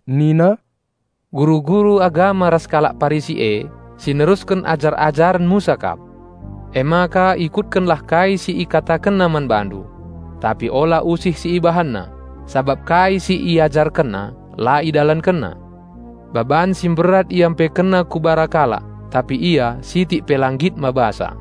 nina, "Guru-guru agama ras kalak Parisi e, si nerusken ajar-ajaren Musa kap. Emaka ikutkenlah kai si ikatakenna man bandu. Tapi ola usih si ibahanna, sabap kai si iajarkenna la idalankenna. Baban si mberat iampekenna ku bara kalak tapi ia sitik pe la nggit mabasa.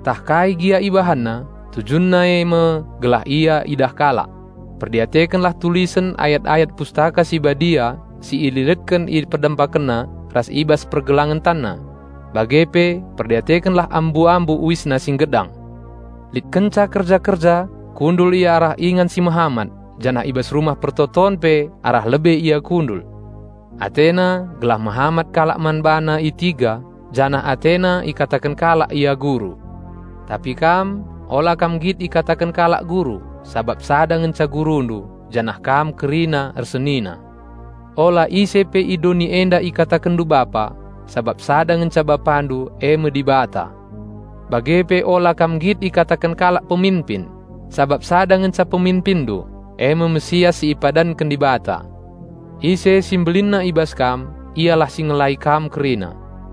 Ntah kai gia ibahanna, tujunna eme gelah ia idah kalak. Perdiatekenlah tulisen ayat-ayat Pustaka Si Badia si ililetken i perdempakenna ras i bas pergelangen tanna! Bage pe perdiatekenlah ambu-ambu uisna si nggedang! Lit kenca kerja-kerja kundul ia arah ingan si mehamat, janah i bas rumah persembahen pe arah lebe ia kundul; atena gelah mehamat kalak man bana i tiga janah atena ikataken kalak ia 'Guru'. Tapi kam, ola kam nggit ikataken kalak 'Guru', sabap sada ngenca Gurundu, janah kam kerina ersenina. Ola ise pe i doni enda ikatakenndu 'Bapa', sabap sada ngenca Bapandu eme Dibata. Bage pe ola kam nggit ikataken kalak 'Peminpin', sabap sada ngenca Peminpinndu eme Raja Penampat si ipadanken Dibata. Ise si mbelinna i bas kam, ialah si ngelai kam kerina.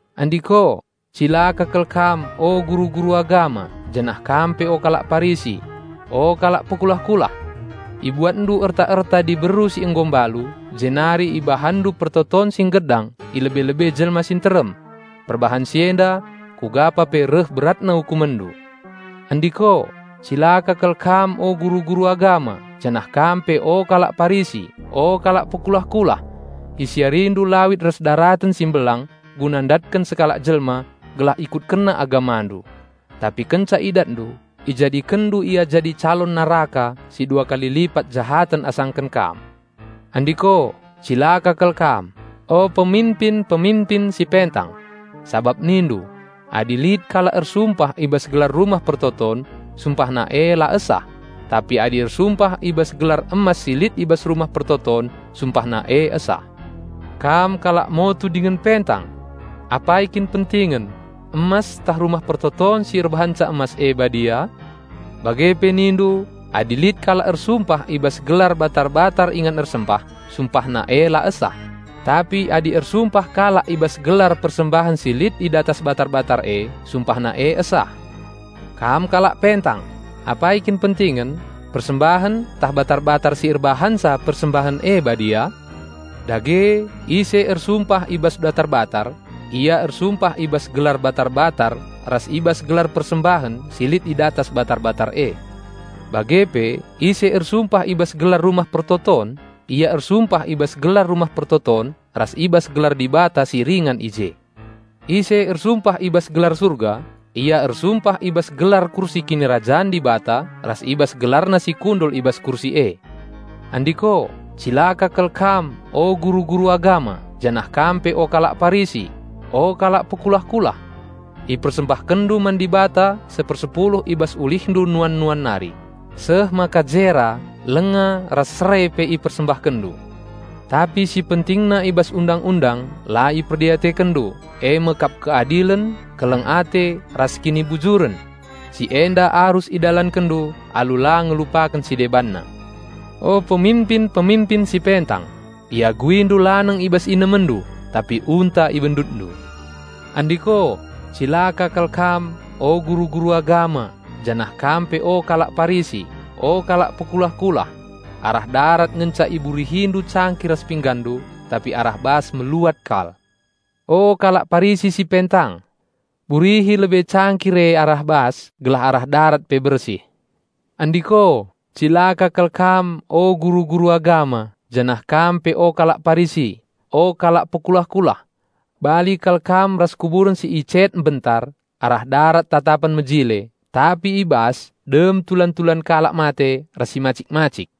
(Andiko, cilaka kal kam o, guru-guru agama, janah kam pe o kalak Parisi! O, kalak pekulah-kulah! Ibuatndu erta-erta diberu si nggo mbalu jenari ibahanndu pertoton si nggedang i lebe-lebe jelma si nterem. Perbahan si enda, kugapa pe reh beratna ukumenndu.) Andiko, cilaka kal kam o guru-guru agama, janah kam pe o, kalak Parisi! O, kalak pekulah-kulah! Isiarindu lawit ras daraten si mbelang guna ndatken sekalak jelma gelah ikutkenna agamandu; tapi kenca idatndu, ijadikenndu ia jadi calon neraka si dua kali lipat jahaten asangken kam. Andiko, cilaka kal kam, o peminpin-peminpin si pentang! Sabap nindu, 'Adi lit kalak ersumpah i bas gelar Rumah Pertoton, sumpahna e la esah; tapi adi ersumpah i bas gelar emas si lit i bas Rumah Pertoton, sumpahna e esah.' Kam kalak motu dingen pentang! Apai kin pentingen, emas ntah Rumah Pertoton si erbahanca emas e badia? Bage pe nindu, 'Adi lit kalak ersumpah i bas gelar batar-batar ingan ersembah, sumpahna e la esah; tapi adi ersumpah kalak i bas gelar persembahen si lit i datas batar-batar e, sumpahna e esah.' Kam kalak pentang! Apai kin pentingen, persembahen ntah batar-batar si erbahanca persembahen e badia? Dage ise ersumpah i bas batar-batar, ia ersumpah i bas gelar batar-batar ras i bas gelar persembahen si lit i datas batar-batar e. Bage pe ise ersumpah i bas gelar Rumah Pertoton, ia ersumpah i bas gelar Rumah Pertoton ras i bas gelar Dibata si ringan i je. Ise ersumpah i bas gelar Surga, ia ersumpah i bas gelar kursi Kinirajan Dibata ras i bas GelarNa si kundul i bas kursi e. Andiko, cilaka kal kam o, guru-guru agama, janah kam pe o, kalak Parisi! O, kalak pekulah-kulah. Ipersembahkenndu man Dibata sepersepuluh i bas ulihndu nuan-nuan nari, seh maka jera, lenga ras serei pe ipersembahkenndu. Tapi si pentingna i bas Undang-undang la iperdiatekenndu, eme kap keadilen, keleng ate, ras kinibujuren. Si enda arus idalankenndu alu la ngelupaken si debanna. O, peminpin-peminpin si pentang! Iaguindu laneng i bas inemendu, tapi unta ibendutndu. Andiko, cilaka kal kam, o, guru-guru agama, janah kam pe o, kalak Parisi! O, kalak pekulah-kulah! Arah darat ngenca iburihindu cangkir ras pinggandu, tapi arah bas meluat kal. O, kalak Parisi si pentang! Burihi lebe cangkir e arah bas gelah arah darat pe bersih. Andiko, cilaka kal kam o, guru-guru agama, janah kam pe o kalak Parisi! O, kalak pekulah-kulah! Bali kal kam ras kuburen si icet mbentar; arah darat tatapen mejile, tapi arah bas dem tulan-tulan kalak mate ras si macik-macik.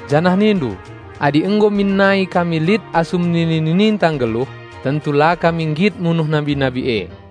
janah nindu, 'Adi nggo min nai kami lit asum nini-nininta nggeluh, tentu la kami nggit munuh nabi-nabi e.'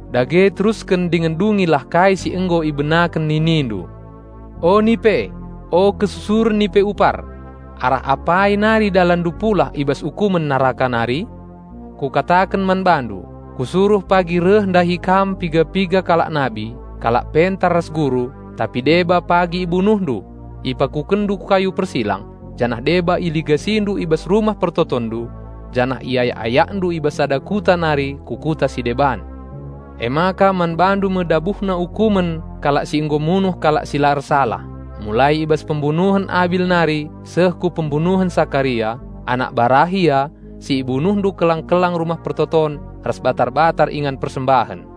Dage terusken dingen dungilah kai si nggo ibenaken ninindu! O, nipe! O, kesusuren nipe upar. Arah apai nari dalanndu pulah i bas ukumen neraka nari? Kukataken man bandu: Kusuruh pagi reh ndahi kam piga-piga kalak nabi, kalak pentar ras guru; tapi deba pagi ibunuhndu, ipakukenndu ku kayu persilang janah deba iligasindu i bas rumah persembahenndu, janah iayak-ayakndu i bas sada kuta nari ku kuta si deban. Emaka man bandu me ndabuhna ukumen kalak si nggo munuh kalak si la ersalah, mulai i bas pembunuhen Abil nari seh ku pembunuhen Sakaria, anak Barahia, si ibunuhndu kelang-kelang Rumah Pertoton ras batar-batar ingan persembahen.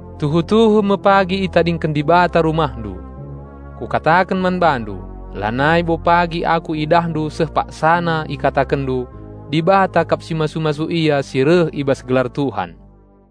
Tuhu-tuhu me pagi itadingken Dibata rumahndu. Kukataken man bandu: Lanai bo pagi Aku idahndu seh paksana ikatakenndu, 'Dibata kap si masu-masu Ia si reh i bas gelar Tuhan.'"